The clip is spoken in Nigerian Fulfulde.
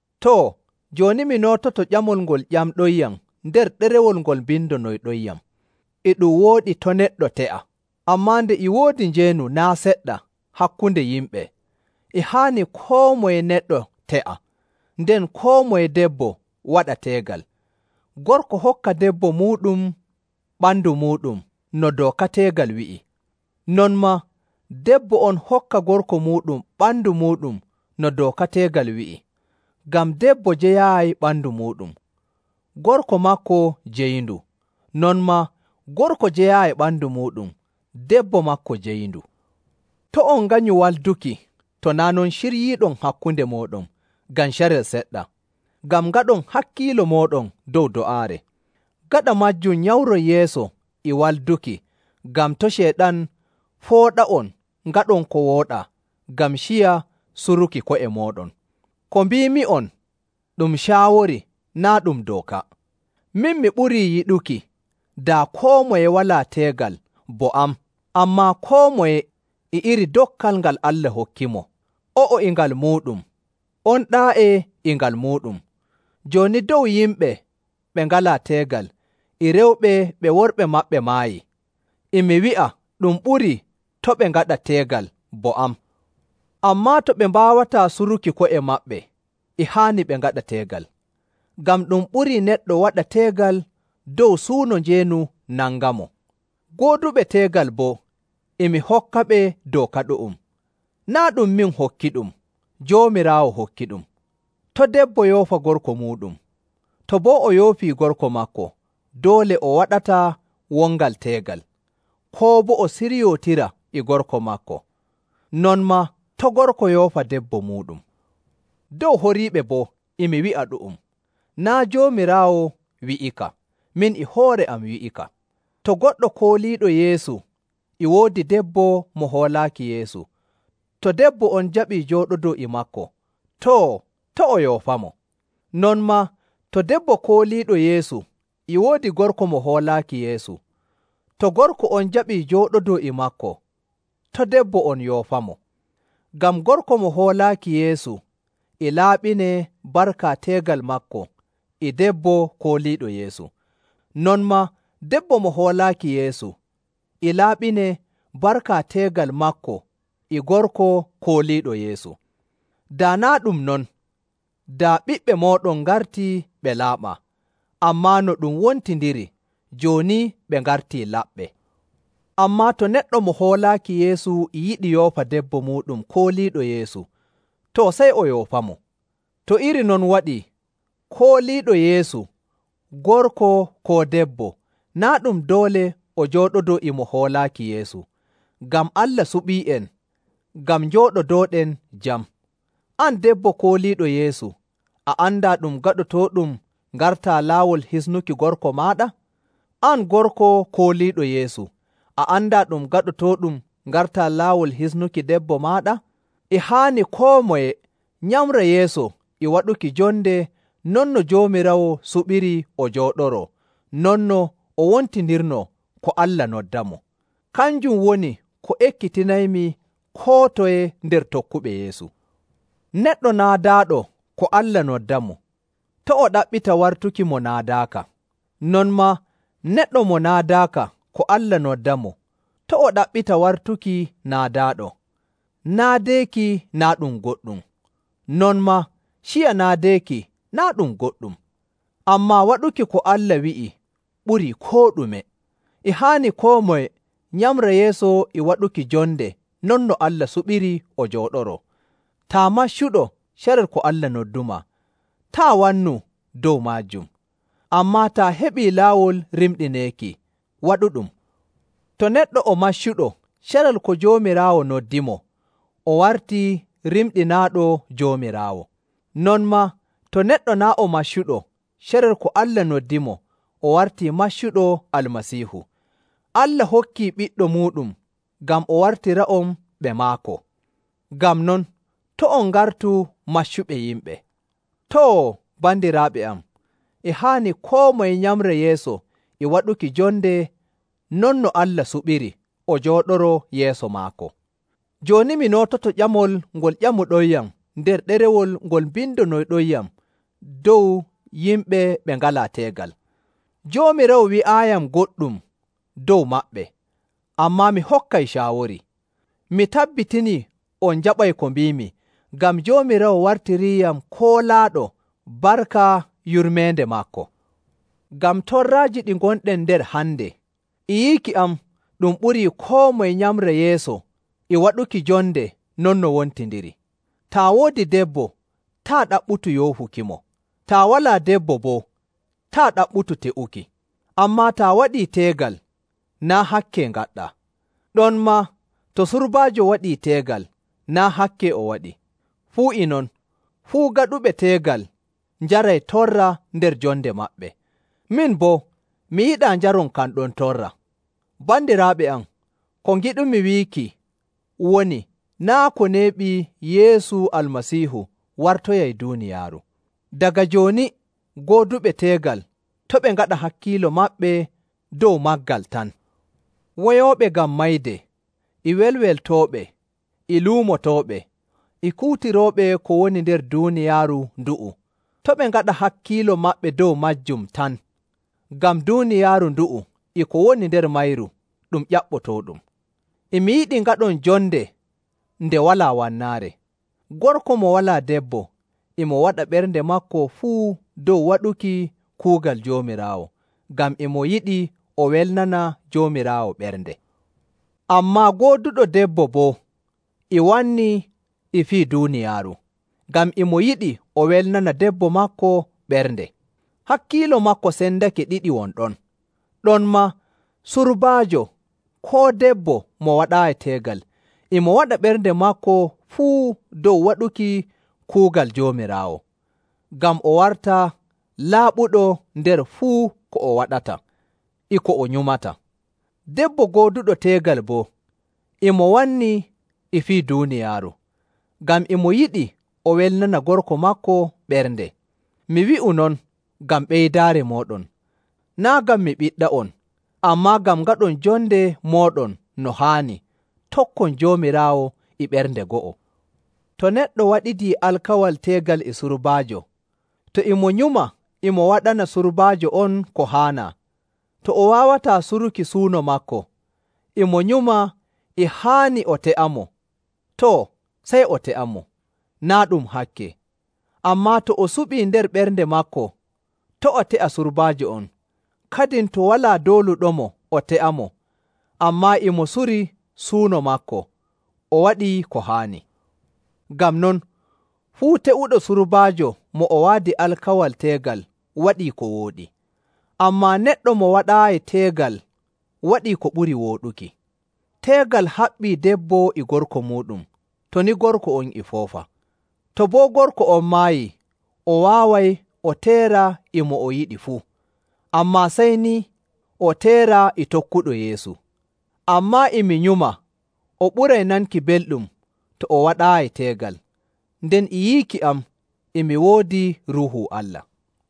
Too, jooni mi noototo ƴamol ngol ƴamɗonyam nder ɗerewol ngol mbindonoyɗonyam: E ɗum wooɗi to' neɗɗo te'a. Ammaa nde e woodi njeenu naa' seɗɗa hakkunde yimɓe, e haani koo moye neɗɗo te'a, nden koo moye debbo waɗa teegal. Gorko hokka debbo muuɗum ɓandu muuɗum no dooka teegal wi'i. Non maa debbo on hokka gorko muuɗum ɓandu muuɗum no dooka teegal wi'i. Ngam debbo jeyaayi ɓandu muuɗum; gorko maako jeyindu. Non maa gorko jeyaayi ɓandu muuɗum, debbo maako jeyindu. To' on nganyu walduki to naa' non ciryiiɗon hakkunde mooɗon ngam carel seɗɗa, ngam ngaɗon hakkiilo mooɗon dow do'aare. Gaɗa maajum nyamron yeeso e walduki ngam to' Ceyɗan fooɗa'on ngaɗon ko wooɗaa ngam ciya suruki ko'e mooɗon. Ko mbiimi'on, ɗum caawori, naa' ɗum dooka. Min mi ɓurii yiɗuki daa koo moye walaa teegal bo am! Ammaa koo moye e iri dokkal ngal Allah hokkimo, o'o e ngal muuɗum, on ɗaa'e e ngal muuɗum. Jooni dow yimɓe ɓe ngalaa teegal e rewɓe ɓe worɓe maɓɓe maayi, e mi wi'a ɗum ɓurii to' ɓe ngaɗa teegal bo am. Ammaa to ɓe mbaawataa suruki ko'e maɓɓe, e haani ɓe ngaɗa teegal. Ngam ɗum ɓurii neɗɗo waɗa teegal dow suuno njeenu nangamo. Gooduɓe teegal boo e mi hokkaɓe dooka ɗu'um. Naa' ɗum min hokkiɗum, Joomiraawo hokkiɗum: To' debbo yoofa gorko muuɗum. To boo o yoofii gorko maako, doole o waɗataa wongal teegal, koo boo o siryootira e gorko maako. Non maa to' gorko yoofa debbo muuɗum. Dow horiiɓe boo e mi wi'a ɗu'um, naa' Joomiraawo wi'ika, min e hoore am wi'ika. To goɗɗo kooliiɗo Yeesu e woodi debbo mo hoolaaki Yeesu, to debbo on jaɓii njooɗodoo e maako, too, to' o yoofamo. Non maa to debbo kooliiɗo Yeesu e woodi gorko mo hoolaaki Yeesu, to gorko on jaɓii jooɗodoo e maako, to' debbo on yoofamo. Ngam gorko mo hoolaaki Yeesu e laaɓinee barka teegal maako e debbo kooliiɗo Yeesu. Non maa debbo mo hoolaaki Yeesu e laaɓinee barka teegal maako e gorko kooliiɗo Yeesu. Daa naa' ɗum non, daa ɓiɓɓe mooɗon ngartii ɓe laaɓaa, ammaa no ɗum wontindiri jooni ɓe ngartii laɓɓe. Ammaa to neɗɗo mo hoolaaki Yeesu e yiɗi yoofa debbo muuɗum kooliiɗo Yeesu, too, sey o yoofamo. To iri non waɗii, kooliiɗo Yeesu gorko koo debbo naa' ɗum doole o jooɗodoo e mo hoolaaki Yeesu, ngam Allah suɓii'en ngam njooɗodooɗen jam. An debbo kooliiɗo Yeesu, a andaa ɗum gaɗotooɗum ngartaa laawol hisnuki gorko maaɗa? An gorko kooliiɗo Yeesu, a andaa ɗum gaɗotooɗum ngartaa laawol hisnuki debbo maaɗa? E haani koo moye nyamra yeeso e waɗuki jonde non no Joomiraawo suɓiri o jooɗoroo non no o wontindirnoo ko Allah noddamo. Kanjum woni ko ekkitinaymi koo toye nder tokkuɓe Yeesu. Neɗɗo naadaaɗo ko Allah noddamo, to' o ɗaɓɓita wartuki mo naadaaka. Non maa neɗɗo mo naadaaka ko Allah noddamo, to' o ɗaɓɓita wartuki naadaaɗo. Naadeeki naa' ɗum goɗɗum, non maa ciya naadeeki naa' ɗum goɗɗum. Ammaa waɗuki ko Allah wi'i ɓurii koo ɗume. E haani koo moye nyamra yeeso e waɗuki jonde non no Allah suɓiri o jooɗoroo. Taa maccuɗo carel ko Allah noddumaa, taa' wannu dow maajum. Ammaa taa heɓii laawol rimɗineeki, waɗuɗum. To neɗɗo o maccuɗo carel ko Joomiraawo noddimo, o wartii rimɗinaaɗo Joomiraawo. Non maa to neɗɗo naa' o maccuɗo carel ko Allah noddimo, o wartii maccuɗo Almasiihu. Allah hokkii Ɓiɗɗo muuɗum ngam o wartira'on ɓe maako. Ngam non, to' on ngartu maccuɓe yimɓe. Too, bandiraaɓe am, e haani koo moye nyamra yeeso e waɗuki jonde non no Allah suɓiri o jooɗoroo yeeso maako. Jooni mi noototo ƴamol ngol ƴamɗonyam nder ɗerewol ngol mbindonoyɗonyam dow yimɓe ɓe ngalaa teegal. Joomiraawo wi'aayiyam goɗɗum dow maɓɓe, ammaa mi hokkay caawori. Mi tabbitinii on njaɓay ko mbiimi ngam Joomiraawo wartiriiyam koolaaɗo barka yurmeende maako. Ngam torraaji ɗi ngonɗen nder hande, e yiiki am ɗum ɓurii koo moye nyamra yeeso e waɗuki jonde non no wontindiri. Taa woodi debbo, taa' ɗaɓɓutu yoofukimo. Taa walaa debbo boo, taa' ɗaɓɓutu te'uki. Ammaa taa waɗii teegal, naa' hakke ngaɗɗaa. Ɗonmaa to surbaajo waɗii teegal, naa' hakke o waɗi. Fuu e non, fuu gaɗuɓe teegal njaray torra nder jonde maɓɓe. Min boo, mi yiɗaa njaron kan ɗon torra. Bandiraaɓe am, ko ngiɗumi wiiki woni naa' ko neeɓi Yeesu Almasiihu wartoyay duuniyaaru. Daga jooni gooduɓe teegal to' ɓe ngaɗa hakkiilo maɓɓe dow maagal tan. Woyooɓe ngam mayde, e welweltooɓe, e luumotooɓe, e kuutirooɓe ko woni nder duuniyaaru ndu'u, to' ɓe ngaɗa hakkiilo maɓɓe dow maajum tan, ngam duuniyaaru ndu'u e ko woni nder mayru ɗum ƴaɓɓotooɗum. E mi yiɗi ngaɗon jonde nde walaa wannaare. Gorko mo walaa debbo e mo waɗa ɓernde maako fuu dow waɗuki kuugal Joomiraawo, ngam e mo yiɗi o welnana Joomiraawo ɓernde. Ammaa gooduɗo debbo boo e wanni e fii duuniyaaru, ngam e mo yiɗi o welnana debbo maako ɓernde. Hakkiilo maako sendake ɗiɗi won ɗon. Ɗonmaa surbaajo koo debbo mo waɗaayi teegal e mo waɗa ɓernde maako fuu dow waɗuki kuugal Joomiraawo, ngam o warta laaɓuɗo nder fuu ko o waɗata e ko o nyumata. Debbo gooduɗo teegal boo e mo wanni e fii duuniyaaru, ngam e mo yiɗi o welnana gorko maako ɓernde. Mi wi'u non ngam ɓeydaari mooɗon, naa' ngam mi ɓiɗɗa'on, ammaa ngam ngaɗon jonde mooɗon no haani, tokkon Joomiraawo e ɓernde go'o. To neɗɗo waɗidii alkawal teegal e surbaajo, to e mo nyuma e mo waɗana surbaajo on ko haanaa, to o waawataa suruki suuno maako, e mo nyuma e haani o te'amo, too, sey o te'amo, naa' ɗum hakke. Ammaa to o suɓii nder ɓernde maako to' o te'a surbaajo on, kadin to walaa dooluɗomo o te'amo, ammaa e mo suri suuno maako, o waɗii ko haani. Ngam non, fuu te'uɗo surbaajo mo o waadi alkawal teegal waɗii ko wooɗi, ammaa neɗɗo mo waɗaayi teegal waɗii ko ɓuri wooɗuki. Teegal haɓɓii debbo e gorko muuɗum, to ni gorko on e foofa. To boo gorko on maayii, o waaway o teera e mo o yiɗi fuu, ammaa sey ni o teera e tokkuɗo Yeesu. Ammaa e mi nyuma o ɓuray nanki belɗum to o waɗaayi teegal, nden e yiiki am e mi woodi Ruuhu Allah.